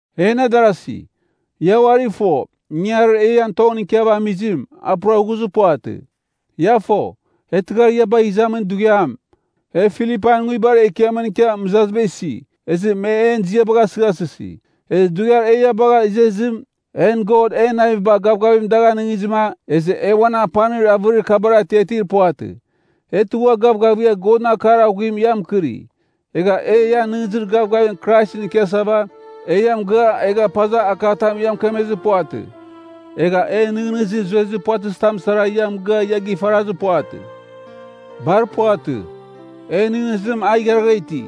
En adarasi, ia uari fo, ingangarir e ian tongɨn ikiava amizim, a pura ghuzɨ puvatɨ. Ia fo, e tɨghar ia bagh izamin dughiam, e Filipain nguibar ekiamɨn ikia mɨzaziba isi, ezɨ me en ziabagh asɨghasɨsi. Ezɨ dughiar e ia bagha izezim, en God en naviba gavgavim dagh anɨngizɨma, ezɨ e uan apanir avɨrir kabar atiatir puvatɨ. E tugha gavgavigha Godɨn akar aghuim ia mɨkɨri. Egha e ia nɨghnɨzir gavgavim Kraisɨn ikiasava, e ia mɨgɨa, egha pazav akatamɨn ia mɨkemezɨ puvatɨ, egha e nɨghnɨzir zuezir puvatɨzitam sara ia mɨgɨa ia gifarazir puvatɨ. Bar puvatɨ. En nɨghnɨzim a igharagha iti.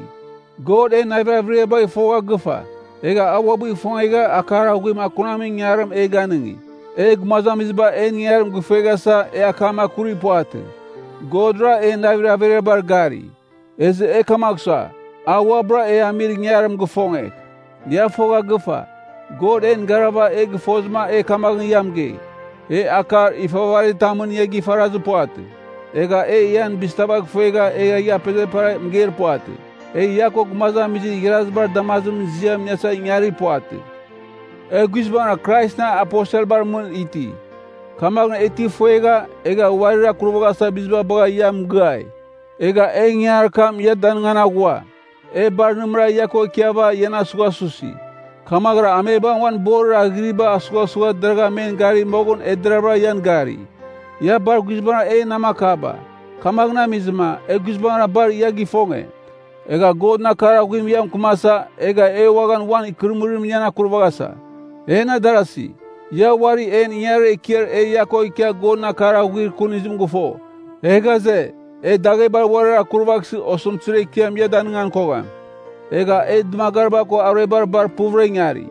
God en navir averiabagh fogha gɨvagha, egha a uabɨ ifongegha akar aghuim akunamin ingangarim e ganɨngi. E gumazamiziba en ingangarim gifueghasa, e akam akurir puvatɨ. Godra en navir averiabar gari. Ezɨ e kamagh sua, a uabɨra e amir ingangarim gifongegh. Ia fogha gɨfa, God en garava e gɨfozɨma e kamaghɨn ia mɨgei, e akar ifavaritamɨn ia gifarazir puvatɨ, egha e ian bizibagh ifuegha egha ia apezepera mɨgeir puvatɨ. E, ia ko gumazamizir igharazibar damazimɨn ziam iniasa ingangarir puvatɨ. E guizbangɨra Kraisɨn aposelbar mɨn iti. Kamaghɨn e ti ifuegha, egha uarir akurvaghasava biziba bagha ia mɨgɨai. Egha e ingangarir ekiam ia danɨngan aghua. E bar nɨmɨra ia ko ikiava ian asughasusi. Kamaghɨra amebam uan borir aghɨriba asughasugha deragha men gari moghɨn e deravɨra ian gari. Ia bar guizbangɨra en namakaba, kamaghɨn amizɨma, e guizbangɨra bar ia gifonge, egha Godɨn akar aghuim ia mɨkɨmasa, egha e uaghan uan ikɨrɨmɨrim ian akurvaghasa. En adarasi, ia uari en ingangarir ekiar e ia ko ikia Godɨn akar aghuir kunizim gɨfo. E ghaze, e daghebar uarir akurvaghsɨ osɨmtɨzir ekiam ia danɨngan kogham. Egha e dɨmagariba ko aruebar bar puvɨra ingari.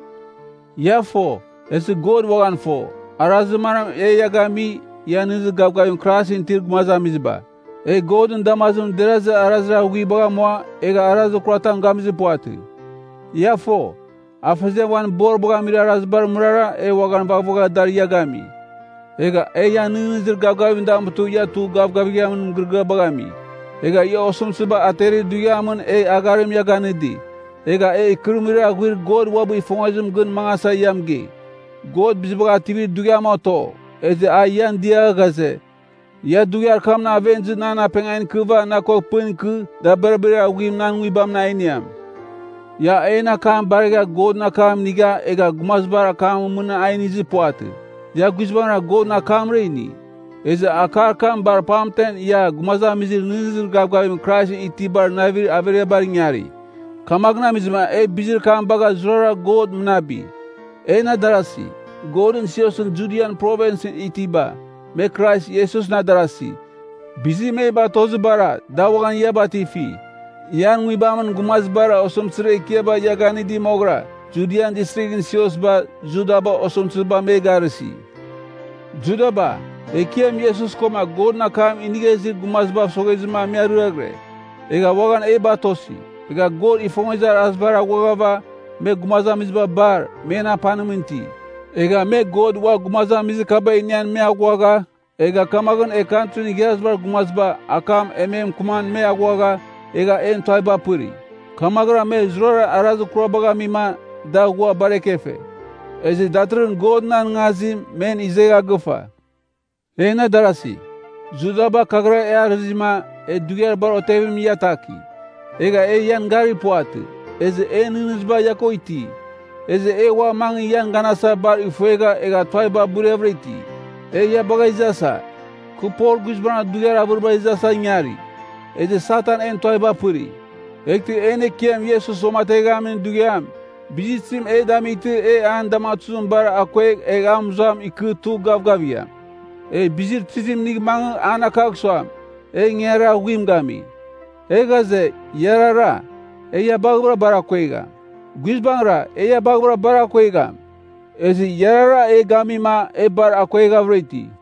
Ia fo, ezɨ God uaghan fo, arazir manam e ia gami, ia nɨghnɨzir gavgavim Kraisɨn itir gumazamiziba. E Godɨn damazimɨn derazir arazir aghuibagh amua, egha arazir kuratam gamizir puvatɨ. Ia fo, afeziam uan boribagh amir arazibar mɨrara e uaghan vaghvagha dar ia gami. Egha e ian nɨghnɨzir gavgavim damutɨ ia tugh gavgavighamin mɨgɨrɨgɨabagh ami. Egha ia osɨmtɨziba aterir dughiamɨn e agharim ia ganɨdi. Egha e ikɨrɨmɨrir aghuir God uabɨ ifongezimɨn gɨn mangasa ia mɨgei. God Bizibagh Ativir Dughiam oto, ezɨ a ian dia ghaze, ia dughiar kamɨn aven izɨ nan apengan ikɨva na ko pɨn ikɨ, dabirabir aghuarim nan Nguibamɨn a iniam. Ia en akam baregha Godɨn akam inigha egha gumazibar akamɨn mɨn a inizir puvatɨ, ia guizbangɨra Godɨn akamra ini. Ezɨ akar kam bar pamten ia gumazamizir nɨghnɨzir gavgavim Kraisɨn itibar navir averiabar ingari. Kamaghɨn amizɨma e bizir kam bagha zurara God mɨnabi. En adarasi, Godɨn siosɨn Judian Provinsɨn itiba, me Krais Iesusɨn adarasi, bizir me batozibara, da uaghan ia batifi. Ian nguibamɨn gumazibara osɨmtɨzir ekiaba ia ganɨdi moghɨra, Judian itir siosba, Judaba osɨmtɨziba me garɨsi. Judaba, Ekiam Iesus koma Godɨn akam inigha izir gumazibav soghezɨma me ariaghɨre, egha uaghan e batosi. Egha God ifongezir arazibar aghuaghava, me gumazamiziba bar, men apanimɨn iti. Egha me God ua gumazamizir kaba inian me aghuagha, egha kamaghɨn e Kantrin Igharazibar Gumaziba akam e me mɨkɨman me aghuagha, egha en tuaviba apɨri. Kamaghɨra me zurara arazir kurabagh amima, da ghua bar ekefe, ezɨ datɨrɨghɨn Godɨn anɨngazim men izegha gɨfa. En adarasi, Judaba kaghɨra e arɨzima, e dughiar bar otevimɨn ia ataki, egha e ian garir puvatɨ, ezɨ en nɨghnɨziba ia ko iti. Ezɨ e ua mangɨ ian ganasa bar ifuegha egha tuaviba buriavɨra iti. E ia bagh izasa; kɨ Pol guizbangɨra dughiar avɨribar izasa ingari, ezɨ Satan en tuaviba apɨri. Eghtɨ en Ekiam Iesus uamateghamin dughiam, bizir tizim e damightɨ e an damatuzimɨn bar akuegh egh a mɨzuam ikɨ tugh gavgavigham? E bizir tizim inigh mangɨ an akagh suam e ingangarir aghuim gami? E ghaze, iarara. E ia baghavɨra bar akuegham. Guizbangɨra, e ia baghavɨra bar akuegham. Ezɨ iarara e gamima e bar akueghavɨra iti.